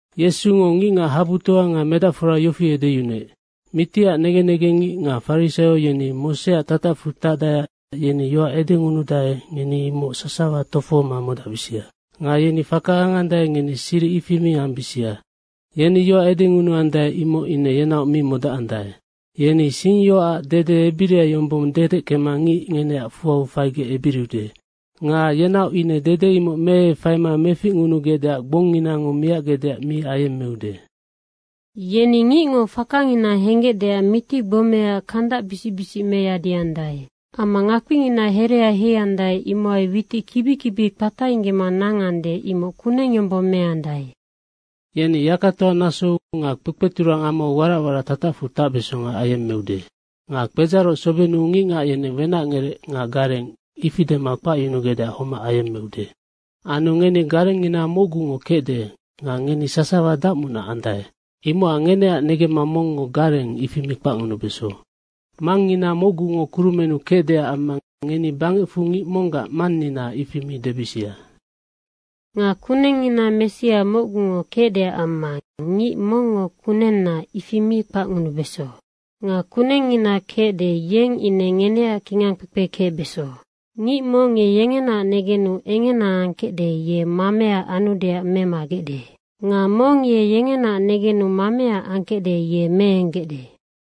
Yesungo ngicngac habutoa nga medacfora yofi edeyunuec, “Mitiac negen negengngic nga farisaio yeni Moseac tatacfu tacdaeac yeni yoac edengunudae, ngeni imoc sasawa tofohoma modacbisia. Nga yeni faka angandae, ngeni siric ifi mi ambisia. Yeni yoac edengunuandae, imoc ine yenaoc mi modacandae. Yeni singyoacac dede ebiria yombong dedeckema ngic ngeneac fuau faigec ebiriude. Nga yenaoc ine dede imoc meefaima meficngunugecdeac gbongnginango miacgecdeac mi ayemmeude. Yeni ngicngo fakangina henggecdeac mitigbomea kandacbisic bisicngina meyadiandae. Amma ngakpingina herea heiandae, imohai witic kibi kibi kpatainggema nangande, imoc kuneng yombong meandae. Yeni yakatoa nasou nga kpekpeturang amau warac warac tatacfu tacbesonga ayemmeude. Nga kpedzaroc sobennu ngicngac yeneng ‘Wenacngerec.’ nga ‘Gareng,’ ifi dema kpacyunugecdeac homac ayemmeude. Anu ngeni garengngina mocgungo kecde nga ngeni sasawa dacmunac andae. Imocac ngeneac negemma mongngo ‘Gareng,’ ifi mi kpacngunubeso. Mangngina mocgungo kurumennu kecdeac amma ngeni bangecfu ngic monggac ‘Mannina,’ ifi mi debisia. Nga kunengngina Messia mocgungo kecdeac amma ngic mongngo ‘Kunenna,’ ifi mi kpacngunubeso. Nga kunengngina kecde, yeng ine ngeneac kingangkpekpe kecbeso. Ngic mong ye yengenaac negenu engena angkecde, ye mamea anudeac memagecde. Nga mong ye yengenaac negenu mamea angkecde, ye meenggecde.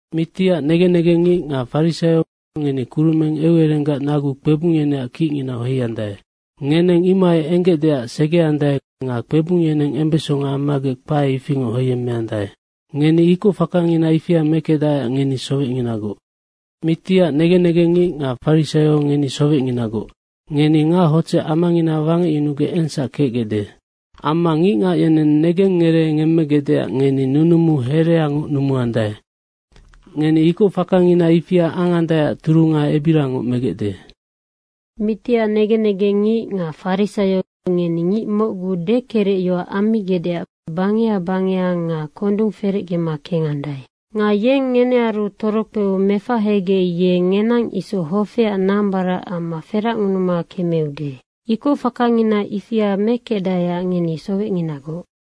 Mitiac negen negengngic nga farisaio, ngeni kurumeng eucererenggac nagu kpebung yeneac kicnginau heiandae. Ngeneng imohai enggecdeac segeandae nga kpebung yeneng embesonga ammagec kpae ifingoc heiyemmekecdae. Ngeni ikocfakangina ifia mekecdaeac ngeni sowecnginagoc. Mitiac negen negengngic nga farisaio ngeni sowecnginagoc. Ngeni ngachodzec amangina wangecyunugec engsac kecgecde. Amma ngicngac yeneng negengngeree ngemmegecdeac ngeni nunumu hereangoc numuandae. Ngeni ikocfaka ifia angandaeac turunga ebiriangoc megecde. Mitiac negen negengngic nga farisaio, ngeni ngic mocgu dekerecyoac ammigecdeac bangeha bangeha nga kondung ferecgema kengandae. Nga yeng ngenearu torokpeu mefahegec, ye ngenang isoc hofeac nambarac amma feracngunuma kemeude. Ikocfakangina ifia mekecdaeac ngeni sowecnginagoc.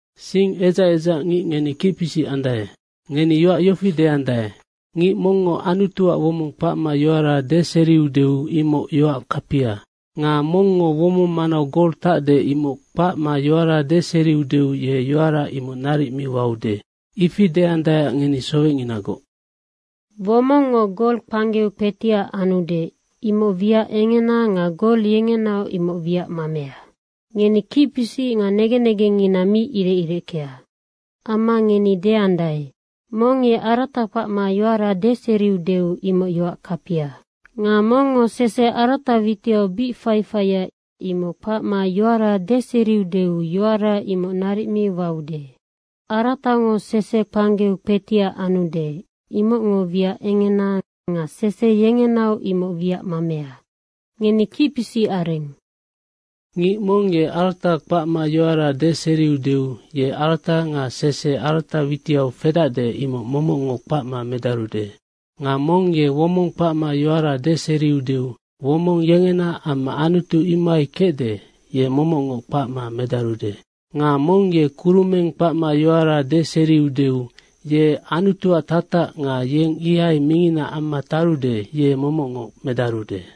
Sing edzac edzac ngic, ngeninoc kicpisic andae. Ngeni yoac yofi deandae, ‘Ngic mongngo Anutuac womong kpacma yoara deseriudeu, imoc yoac kapia. Nga mongngo womong manau gol tacde, imoc kpacma yoara deseriudeu ye yoara imoc naric mi waude.’ Ifi deandaeac ngeni sowecnginagoc. Womongngo gol kpanggeu kpetiac anude, imoc wiac engena nga gol yengenaoc imoc wiac mamea. Ngeni kicpisic nga negen negengngina mi irec ireckea. Amma ngeni deandae, ‘Mong ye arata kpacma yoara deseriudeu, imoc yoac kapia. Nga mongngo sese arata witiau bic faifaia, imoc kpacma yoara deseriudeu yoara imoc naric mi waude.’ Aratango sese kpanggeu kpetiac anudenoc, imocngo wiac engena nga sese yengenaoc imoc wiac mamea. Ngeni kicpisic areng. Ngic mong ye arata kpacma yoara deseriudeu ye arata nga sese arata witiau fedacde, imoc momocngoc kpacma medarude. Nga mong ye womong kpacma yoara deseriudeu womong yengena amma Anutu imohai kecde, ye momocngoc kpacma medarude. Nga mong ye kurumeng kpacma yoara deseriudeu, ye Anutuac tatac nga yeng ihai mingina amma tarude, ye momocngoc medarude.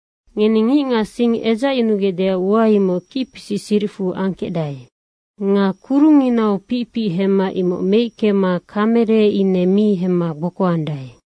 Ngeni ngicngac sing edzacyunugecdeac ua, imoc kicpisic siricfu angkecdae. Nga kurungnginau picpic hemma imoc meickema kamere ine mi hemma gbokoandae.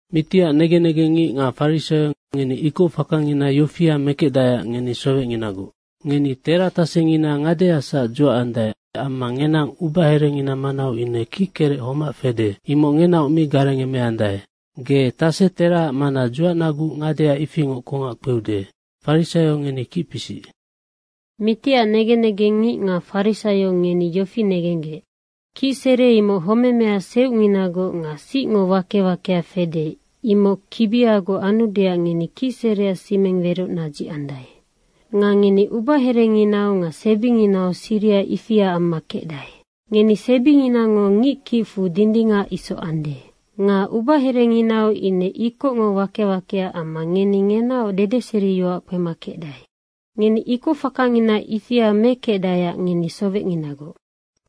Mitiac negen negengngic nga farisaio, ngeni ikocfakangina yofia mekecdaeac ngeni sowecnginagoc. Ngeni tera tasengina ngadeasac dzuacandae amma ngenang ubaherengina manau ine kickerec homac fede, imoc ngenaoc mi garengemeandae. Ge tase teraac mana dzuacnaguc ngadea ifingoc kongac kpeude. Farisaio ngeni kicpisic. Mitiac negen negengngic nga farisaio ngeni yofi negenggec, kicsere imoc homemea seucnginagoc nga sicngo wake wakea fede, imoc kibiagoc anudeac ngeni kicsereac simeng weroc nadzicandae. Nga ngeni ubaherenginau nga sebinginau siriha ifia amma kecdae. Ngeni sebinginango ngickicfu dindingac isoc ande. Nga ubaherenginau ine ikocngo wake wakea amma ngeni ngenaoc dedeseriyoac kpema kecdae. Ngeni ikocfakangina ifia mekecdaeac ngeni sowecnginagoc.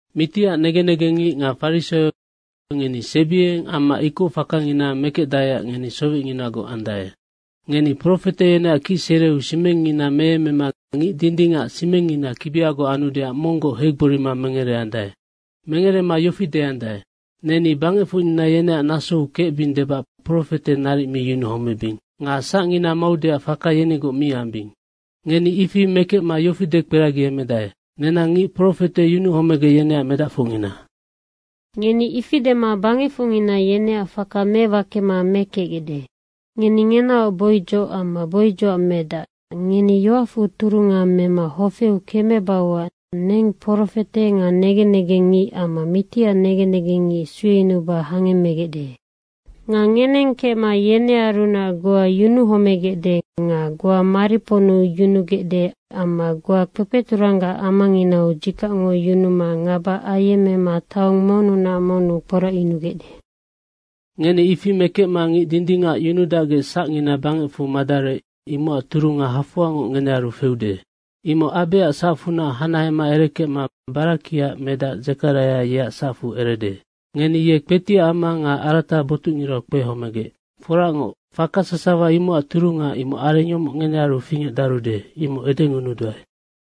Mitiac negen negengngic nga farisaio, ngeni sebiengeneng amma ikocfakangina mekecdaeac sowecnginagoc andae. Ngeni profete yeneac kicsereu simengngina meyemmema ngic dindingac simengngina kibiagoc anudeac monggoc heigborima mengereandae. Mengerema yofi deandae, ‘Neni bangecfocnina yeneac nasou kecbing debac profete naric mi yunuhomebing nga sacngina maudeac faka yenigoc mi ambing.’ Ngeni ifi mekecma yofi dekperagiemedae, ‘Nenang ngic profete yunuhomegec, yeneac medacfocngina.’ Ngeni ifi dema bangecfocngina yeneac faka mewakema mekecgecde. Ngeni ngenaoc boidzoc amma boidzocac medac, ngeni yoacfu turunga mema hofeu kemebauac neng profete nga negen negengngic amma mitiac negen negengngic sueyunuba hangemmegecde. Nga ngeneng kecma yenearunac goa yunuhomegecde nga goa mariponnu yunugecde amma goa kpekpeturang amanginau dzikacngo yunuma ngaba ayemmema taong monnunac monnu kporacyunugecde. Ngeni ifi mekecma ngic dindingac yunudacgec sacngina bangecfu madarec, imocac turunga hafoangoc ngenearu feude. Imoc Abeac sacfunac hanahema erekecma Barakiaac medac Dzekaraia, yeac sacfu erede. Ngeni ye kpetiac ama nga arata botucngirau kpehomegec. Foracngoc, faka sasawa imocac turunga, imoc areng yomoc ngenearu fingecdarude, imoc edengunuduae.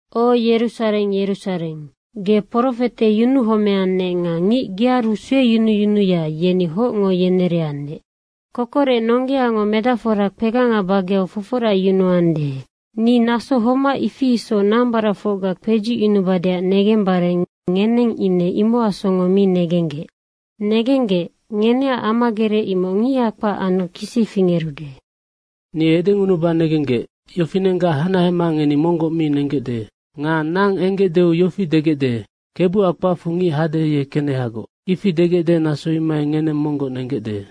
O, Yerusareng, Yerusareng, ge profete yunuhomeannec nga ngic gearu sueyunuyunuya, yeni hocngo yenereannec. Kokorec nonggeango nambaracfora kpeganga bageau foforacyunuande, ni naso homac ifi isoc nambaracfocga kpedzucyunubadeac negembare ngeneng ine imocac songo mi negenggec. Negenggec, ngeneac amagerec imoc ngiha kpac anu kisi fingerude. Ni edengunuba negenggec, yofinenggac hanahema ngeni monggoc mi nenggecde. Nga nang enggecdeu yofi degecde, ‘Kebuac kpacfu ngic hade, ye kenehagoc.’ ifi degecde, naso imohai ngeneng monggoc nenggecde.”